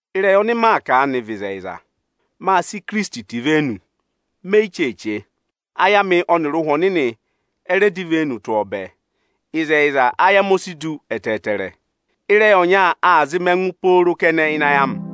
Ịrẹyị ọnị maa kà aanị vị ịzẹyịza. Mâ sị Ikirisiti tẹ ivenu, me yi cheeche. Ayị amị ọnịrị Ụhwẹ Ohomorihi ọ rẹ dọ ivenu tụ́ ọọ bẹẹ. Ịzẹyịza, ayị amị o si du ẹtẹẹtẹrẹ, ịrẹyị ọnya aa zị mị ẹngụ pooro kẹnẹ ịnị ayị amị.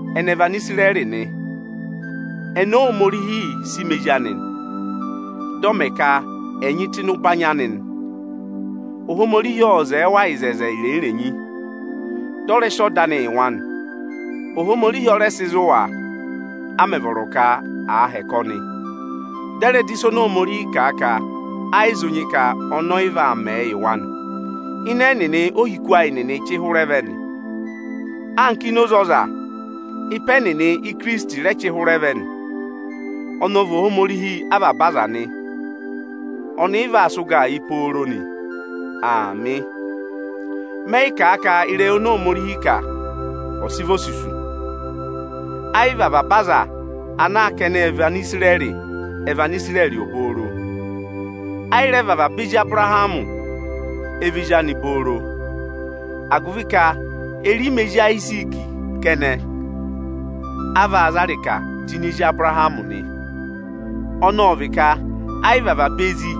ẹnị ẹ vị Anisirẹrị nị, ẹnị Óhomorihi sị Mẹ ezi anị, dị ọ mẹ ka ẹ̀ nyị tụ́ ịnị ụbanyị anị nị. Ohomorihi ô wo oto irenyi-irenyi yị wa, dị ọ rẹ sị ọda anị yị wa nị. Ohomorihi ọ rẹ sị zụ wa a mẹ̀ vọrọ ka àa hẹkẹ ọnị, dị ẹ̀ rẹ dọ ịsa oni Ohomorihi kà a ka ẹ yị zụ nyị ka ọnị ọ yị vaa mẹẹ yị wa nị. Ịdị ẹnịnị ohiku ayị chị hụrẹ vẹ nị. Anka ọzarẹyịrẹsụ, ịpa ẹnịnị Óhinọyị oni Ohomorihi nyị ka ọ̀ dọ yị há chị hụrẹ vẹ nị. Ọnị ọ̀ vị Ohomorihi avaba aza nị, ọnị ị vaa sị ụgaa yị pooro nị. Aamị. Mẹ yị kà a ka ịrẹyị oni Ohomorihi kà, ọ sị vị osusu. Ẹ yị vị avaba aza ana ka ẹnị vị Anisirẹrị, ẹ̀ vị Anisirẹrị obooro. Ẹ yị rẹ vị avaba ezi Abụrahamị ẹ vị ezi anị obooro, agụvị ka erima ezi Ayiziiki kẹnẹ, a vaa za ịrịkaa tụ́ ịnị ezi Abụrahamị nị. Ọnọọ ọ vị ka ẹ yị vị avaba ezi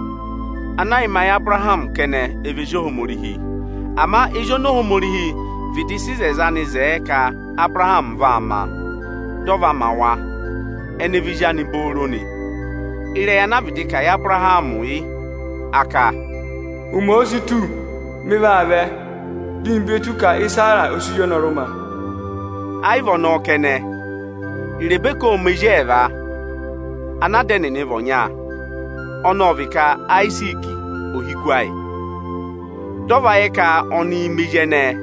ana ẹ yị ma yị Abụrahamị kẹnẹ, ẹ vị ezi Ohomorihi. Ama ezi ọnị vịdị sị ịzẹzẹ anị zẹẹ ka Abụrahamị vaa ma, dị ọ va ma wa, ẹnị ẹ vị ezi anị obooro nị. Ịrẹyị ana a vịdị kà yị Abụrahamị yị. Ohomorihi ka: Ụmẹ òo si tù, ọnị vaa vẹ, dị ọnị ve tù ka Ịsara ọ sị ozi ọnọrụ ma. Ẹ yị vị ọnọọ kẹnẹ; Irebeka ộ ma ezi ẹẹva, ana ada ẹnịnị vị ọnya. Ada ẹnịnị ọnọọ ọ vị Ayiziiki, ohiku ayị nị. Ama dị ọ va yẹ ka ọnịị ma ezi ẹnẹẹ,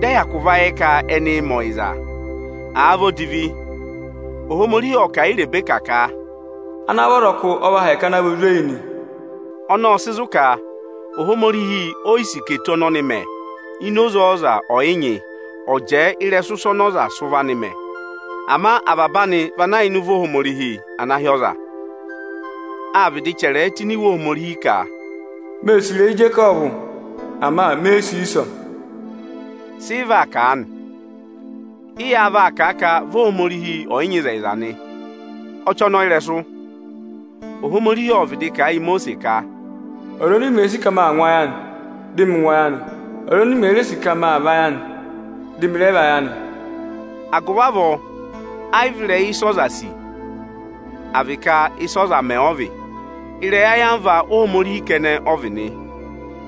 dị ẹ hyakụ va yẹ ka ẹnịị mẹ ọyịza, àa vị odivi, Ohomorihi ộ kà a yị Irebeka ka: Ana vị ọzọkụ ọ vaa hẹkẹ ana vị Ozweyi nị. Ọnọọ ộ sị zụ̀ ka Ohomorihi o yi sì eto ọnị ọnị mẹ ini oze ọza ọyịnyị, ọ̀ jẹẹ ịrẹsụ ịsa ọnị ọza sị ụvọ anị mẹ. Ama avaba anị vị ana yà ịnị ụvọ Ohomorihi ana hị́ ọza. Á vịdị chẹrẹ ẹ tụ́ ini Iwe Ohomorihi ka: Oni ô sì ịrẹyị Ijekọvụ, ama oni e yi sì ịrẹyị Iisọ. Sị ị vaa kà aanị? Ị yáá vaa kà a ka vi Ohomorihi ọ̀ yị nyị ịzẹyịza nị? Ọchọnọyịrẹsụ! Ohomorihi ộ vịdị kà a yị Imosiisi ka, “Ọza ọnị ọnị òo sì ka ọnị aa ngụ ayị anị, dị ọnị ngụ ayị anị. Ọza ọnị ọnị òo sì ka ọnị aa vayị anị, dị ọnị rẹ vayị anị.” Agụvị avọọ ẹ yị vị ịrẹyị ịsị ọza sì, à vị ka ịsị ọza mẹ ọ vị, ịrẹyị ayamva Ohomorihi kẹnẹ ọ vị nị.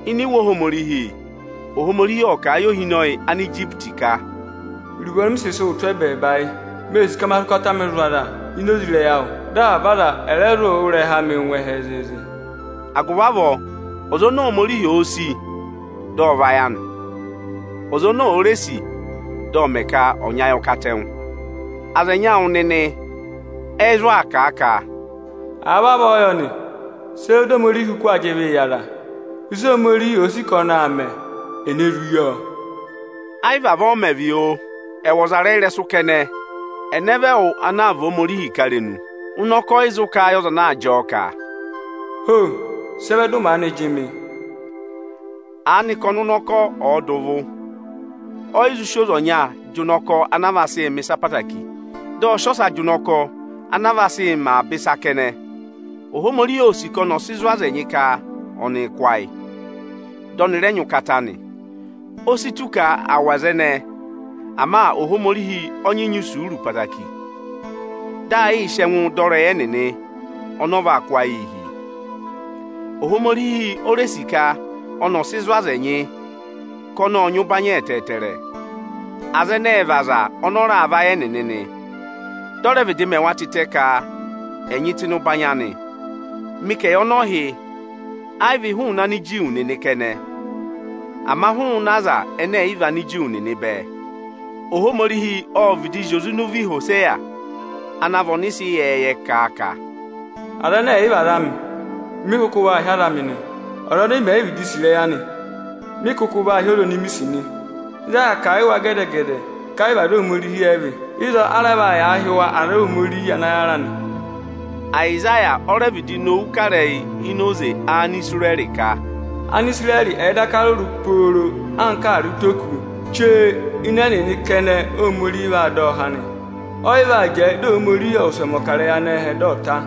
Ini Iwe Ohomorihi, ộ kà a yị ohinọyị Anijipiti ka: Iruvo ọnị ọnị sị sị wụ tụ́ ẹbẹẹba yị: Oni ee sì ka ọnị ọ̀ sị ụkata anị zụ̀ aza ini oze ịrẹyị awụ. Dị avaba aza ẹ̀ rẹ zụ wụ́ ịrẹha anị ngụ ẹhẹ zịịzị. Agụvị avọọ, ọza oni Ohomorihi òo sì, dị ọ vayị anị. Ọza oni òo re sì, dị ọ mẹ ka ọ̀ nyị ayị ọkatẹngụ. Aza ẹnyị awụ nịnị ẹ zụ aa kà a ka: Àa vavọọ yọ nị, sị ẹ vẹ di Ohomorihi kụkụ aa yịị jị ịvịị yị aza? Ịsị Ohomorihi òo sì ka ọnị aa mẹ, ene zụ yi ọọ? Ẹ yị vị avọọ ọ mẹ̀ vị, oo. Ẹwụ ọzarẹyịrẹsụ kẹnẹ, ẹnẹ vị ẹwụ ana aa và Ohomorihi ị̀karenu? Ụnọkọ ọ yị zụ kà a yị ọza ana jị ọọ ka, “Ho, sị ẹ vẹ dị ụ maanị jị mị?” Aanị ka ọnụnọkọ, ọ̀ọ dà ụvụ, ọ yị zụ sị oze ọnya jị ụnọkọ anaa vaa sị mẹ̀ ịsa ẹtẹẹtẹrẹ, dị ọ sị ọsa jị ụnọkọ anaa vaa sị mẹ avaba ịsa kẹnẹ? Ohomorihi óo sì ka ọnị ọ̀ sị zụ̀ aza ẹnyị ka ọnịị̄ kụ́ ayị, dị ọnị rẹ nyị ụkata nị. O si tù ka à wụ̀ aza ẹnẹẹ, ama Ohomorihi ọ nyị nyị isuuru ẹtẹẹtẹrẹ, dị aa yịị sị ẹngụụ dọ ịrẹyị ẹnịnị ọnọọ vaa kụ́ ayịị hi. Ohomorihi o re sì ka ọnị ọ̀ sị zụ̀ aza ẹnyị ka ọnị ộ nyị ụbanyị ẹtẹẹtẹrẹ. Aza ẹnẹẹ ẹ vị aza ọnọọ raà vayị ẹnịnị nị. Dị ọ rẹ vịdị mẹ wa tịtẹ ka ẹ̀ nyị tụ́ ịnị ụbanyị anị. Mị ka ẹyị ọnọọ hị́, ayị vị hụụnị Aniju nịnị kẹnẹ, ama hụụnị Anigiriki nịnị bẹẹ. Ohomorihi ộ vịdị zị oze ịnị ụvọ Ihoseya (ana vị ọnịsẹ ịyẹẹyẹ) kà a ka, “Aza ẹnẹ ẹ̀ yị vị aza amị, mị kụkụ vaa hị́ aza amị nị. Ọza oni mè yi vịdị sì ịrẹyị anị, mị kụkụ vaa hị́ ọza oni mi sì nị. Ịzị aa yà kà a yị wa gẹdẹ-gẹdẹ ka ayị vị aza Ohomorihi ẹ vị, ịzọọ a rẹ vaa yàa hị́ wa aza Ohomorihi ana yàra nị.” Ayịsaya o re vịdị nowu kà ịrẹyị ini oze Anisirẹrị ka, “Anisirẹrị ẹ̀ẹ daka rụrụ pooro anka ààrẹ ụtọ ókụ̄, chee ịnị ẹnịnị kẹnẹ Óhomorihi vaa dọ ọ há nị. Ọ yị vaa jẹẹ dị Ohomorihi ọ̀ wụsẹ mẹ̀ ọkarẹyị anẹhẹ, dị ọ ta.”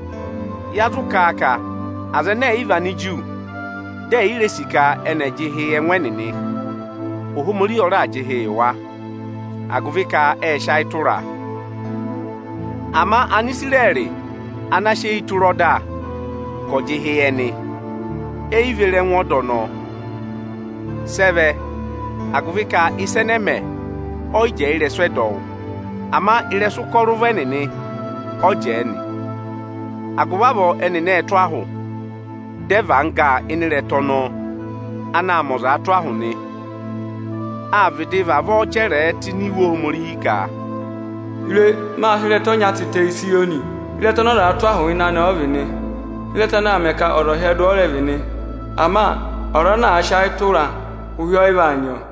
Sị ị vaa kà aanị? Ya zụ kà a ka Anigiriki, dị è yi re sì ka ẹnị ẹ̀ jị ịhị yị ẹngụ ẹnịnị, Ohomorihi ọ raà jị ịhị yị wa, agụvị ka ệ sị ayị tụraa. Ama Anisirẹrị ana sị eyi tụra ọda, ka ọ̀ jị ịhị yị ẹnị, eyi ve re ẹngụ ọda ọnọọ. Sị ẹ vẹ? Agụvị ka ịsa ẹnẹẹ mẹ ọ yị jẹẹ ịrẹsụ ẹdọwụ, ama ị́rẹsụ ụkọrọ ụvọ ẹnịnị ọ jẹẹ nị. Agụvị avọọ ẹnịnị ệ tụ́ ahụ, dị ẹ và angga ịnị ịrẹta ọnọọ anaā mẹ ọzaa tụ́ ahụ nị. Â vịdị vavọọ chẹrẹẹ tụ́ ini Iwe Ohomorihi ka, “Re! Mâ sị ịrẹta ọnya tịtẹ Ịzayọnị; ịrẹta ọnị ọzaā tụ́ ahụ ịnị anị ọ vị nị; ịrẹta anaā mẹ ka ọza ọ̀ hyẹdụ ọ rẹ vị nị. Ama ọza ana àa sị ayị tụraa, ụhị ọyị vaa nyị ọọ.”